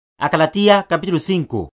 Ekhapelele onethi woKristu.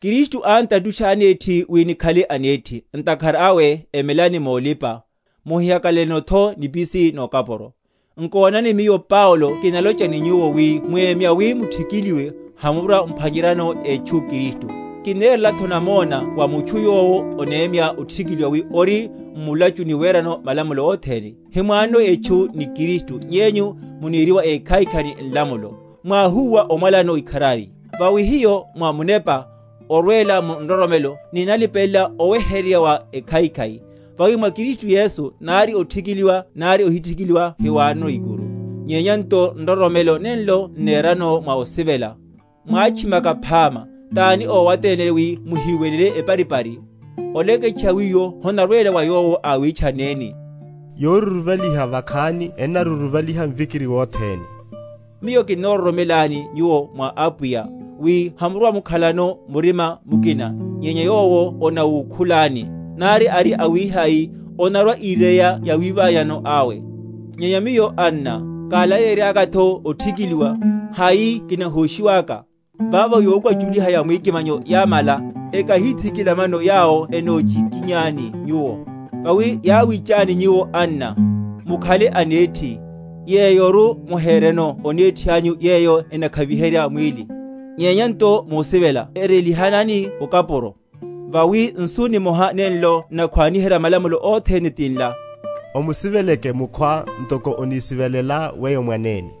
Kristu ántatusha anethi wi nikhale anethi; ntakhara awe emelani molipa, muhihakalaletho n’nipisi nokapuro. Nkonani, miyo Paulo kinalocha ni nyuwo, wi mwemya wi muthikiliwe, hamurwa‐mphwanyeryano etchu Kristu. Kinnerelatho namona wa mutchu yowo onemya othikiliwa, wi ori m’mulachuni werano malamulo othene. Himwanono etchu ni Kristu, nyenyu muneriwa ékhaikhai ni nlamulo; mwáhúwa omwalanano ikharari. Vawi hiyo mwa Munepa, orwela mu nroromelo, ninnalipelela oweheryerya wa ekhaikhai. Vawi mwa Kristu Yesu nari othikiliwa nari ohithikiliwa hiwanono ikuru; nyenya nto nroromelo nenlo n’nerano mwa osivela. Mwátchimaka phama; tani ówaténleni wi muhíwelele eparipari? Oleketcha wiwo honarwela wa yowo awitchanneni. Yoruruvaliha vakhani ennaruruvaliha mvikiri wothene. Miyo kinnororomelani nyuwo mwa Apwiya, wi hamurwamukhalano murima mukina; nyenya yowo onawukhulani, nari ari awihai, onarwa‐ireya yawi?-?ványano awe. Nyenya miyo, anna, kálaleyeryakatho othikiliwa, hai kinahóshiwaka? Vavo yokwachuliha ya mwikimanyo yámala. Ekahíthikila mano, yawo enochikinyani nyuwo. Vawi yáwitchanani nyuwo, anna, mukhale anethi; yeyoru muhereno onethi anyu yeyo enakhaviherya mwíli, nyenya nto musivela erelihanani okapuro. Vawi nsu nimoha nenlo n’nakhwaniherya malamulo othene tinla; Omusiveleke mukhwá ntoko onisivelelá weyo mwanene.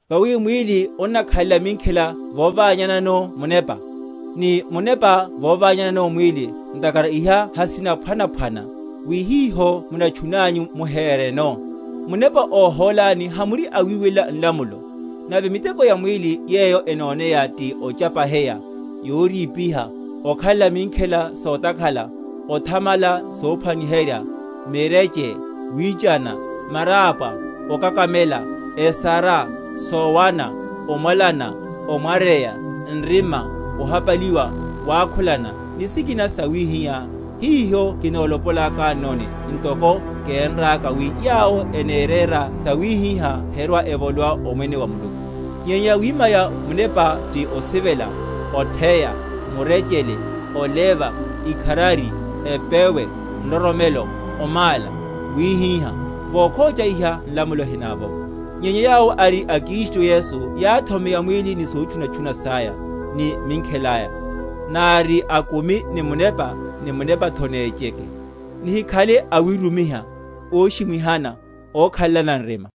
Vawi mwíli onnakhalela minkhela voványanano Munepa, ni Munepa voványanano mwíli; ntakhara iha hasina?-?phwanaphwana; wi hiho munatchunanyu muhereno. Munepa óhólani, hamuri awiwelela nlamulo. Nave miteko ya mwíli yeyo enóneya ti ochapaheya, yorípiha, okhalela minkhela sotakhala, othamala sophwaniherya, mireche, wichana, marápwa, okakamela, esara, sowana, omwalana, omwaryeya, nrima, ohapaliwa, wakhulana, ni sikina sawihiha; hiho kinolopolakannoni, ntoko kénraka, wi yawo eneréra sawihiha herwa‐evolowa Omwene wa Muluku. Nyenya yawima ya Munepa ti osivela, otheya, murechele, oleva, ikharari, epewe, nroromelo, omála, wíhíha, vokhocha iha nlamulo hinavovo. Nyenya yawo ari a Kristu Yesu yáthomeya mwíli, ni sotchunatchuna saya, ni minkhela aya. Nári akumi ni Munepa, ni Munepatho nécheke. Nihikhale awirumiha, óshimwihana, okhalelana nrima.